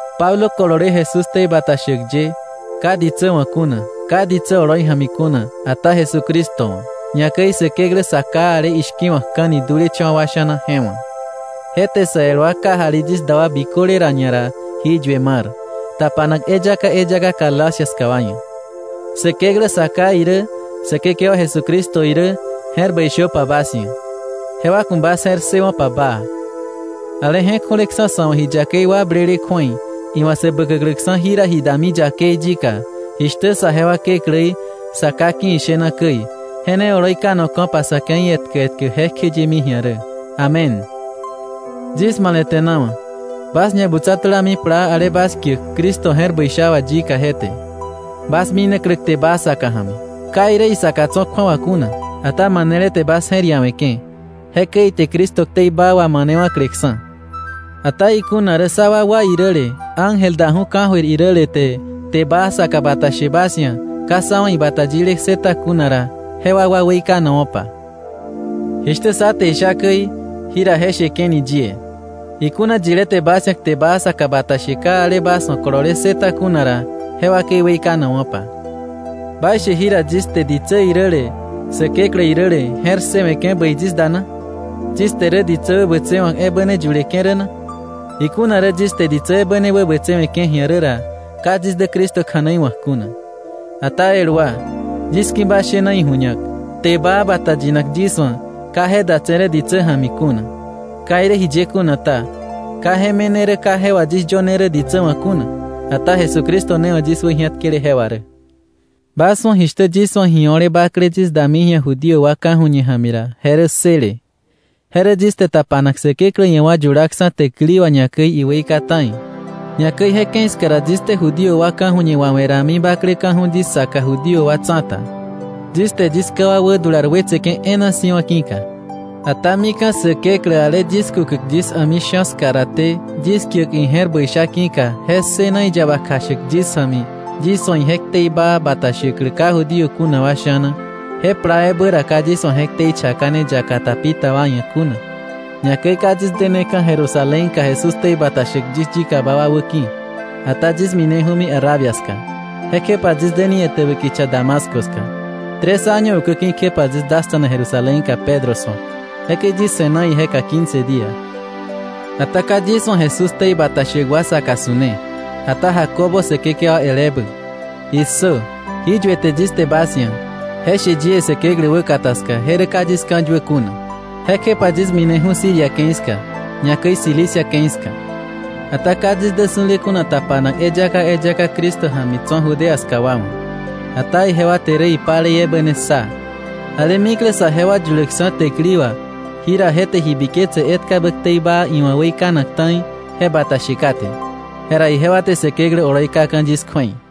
Pablo, kolole Jesús ktei bata shäk ye, ka ditsä wa̱ kuna, ka ditsä oloi ja̱mi kuna, ata Jesucristo wa̱, ñakäi Säkeklä Sa Ká ale ishki̱wa̱kka̱ni dulecha̱wa̱ wa sha̱na je wa̱, je te sa el wa kajali yis da wa biköle ra ñara jí yue mar, tapanak eyaka eyaka Galacia ska wa ia̱. Säkeklä Sa Ká irä Säkekewa Jesucristo irä, je̱r bäi shöpa bas ia̱, jewa ku̱ bas je̱r ssëwo̱pa baa, ale je̱k ju̱leksa̱ sa̱ wa̱ ji yakei wakblele kju̱ei, iwa̱ sä bäkäkläksa̱ jira ji dami yakei yika, jishtä saje wa Kekläí, Sa Ká ki̱ ishena käi, je ne oloi kanoka̱pa sa̱ ke̱i etkä etkä jekjeyemi ji̱a rä. Amén. Yis male̱te̱nawa̱ bas ñabutsa tulami plaa ale bas kiäk Cristo je̱r bäi sha wà yika je te, bas minaklä kte baa saka ja̱mi. Ka irä isaka tso̱ kju̱awa kuna, ata manele te bas je̱r iawe̱ke̱. Jekäi ite Cristo ktei baa wamanewa̱kleksa̱. Ata ikuna rä sá wakwa iräle, ángel daju̱ ka̱jöir iräle, te kte baa saka bata she bas ia̱ ka sá wa̱ ibata yile ssëta kuna ra, je wakwa weikanowa̱pa. Jishtä sá te isha käi, jira je sheke̱ni yie. Ikuna yilé te bas ia̱ kte baa saka bata she ka ale bas wa̱ kolole ssëta kuna ra, je wakei weikanowa̱pa. ¿Baishe jira yis te ditsä iräle Säkeklä iräle je̱r ssëwe̱ke̱ bäi yis da na? ¿Yis te rä ditsä wäbätsewa̱k ebä ne yuleke̱ rä na? Ikuna rä yis te ditsä ebä ne wäbätsewe̱ke̱ ji̱a rä ra, ka yis dä Cristo kja̱nei wa̱k kuna. Ata el wa, yis ki̱ bas shena iju̱ñak, kte baa bata yinak yis wa̱, ka je datse̱ rä ditsä ja̱mi kuna. Ka irä jiye kuna ta, ka je me̱ne rä ka je wà yis yöne rä ditsä wa̱ kuna, ata Jesucristo ne wa̱ yis wäji̱atkele je wà rä. Bas wa̱ jishtä yis wa̱ ji o̱le bakle yis dami ji̱a Judío wa ka̱ju̱ñe ja̱mi ra, je rä ssële, je rä yis te tapanak Säkeklä ia̱ wa yulaksa̱ täkili wà, ñakäi iweika ta̱i. Ñakäi je ke̱i ska ra yis te Judío wa ka̱ju̱ñe wawe̱ rami bakleka̱ju̱ yis saka Judío wa tsa̱ta, yis te yis ká wa wädular wetseke̱ e̱e̱na si̱wa̱ je ki̱ka. Ata mika̱ Säkeklä, ale yis kukäk yis a̱mi sha̱ ska raté, yis kiäk ije̱r bäi sha ki̱ka, je ssëna iyaba kjashäk yis ja̱mi, yis wa̱ ije ktei baa bata shäklä ka Judío kuna wa sha̱na, je plaa ebä ra ka yis wa̱ je ktei chakane yaka ta pi ta wa ia̱, ñakäi ka yis deneka̱ Jerusalénka Jesús ktei bata shäk yis yikaba wa wäki̱. Ata yis mineju̱mi Arabia ska, jekjepa yis deni etäbä kicha Damasco ska. Tres año ukäki̱ kjepa yis dasta̱na Jerusalénka Pedro su̱ak. Jekäi yis se̱na ijeka quince día. Ata ka yis wa̱ Jesús ktei bata shäk wa saka su̱ne, ata Jacobo Säkekewa el ebä. ¡Issö! Jí yuete yis te bas ia̱, je she yie Säkeklä wäkata ska, je rä ka yis ka̱yuä kuna. Jekjepa yis mineju̱ Siria ke̱i ska, ñakäi Cilicia ke̱i ska. Ata ka yis dä su̱le kuna tapanak eyaka eyaka Cristo ja̱mi tso̱ Judea ska wa wa̱. Ata ijewa te rä ipalei ebä ne ssa: “Ale mikle saje wa yuläkksa̱ täkili wà, jira je te ji biketse etkabä ktei baa iwa̱ weikanak ta̱i je bata she kate.” Jera ijewa te Säkeklä oloi kaka̱ yis kju̱ei.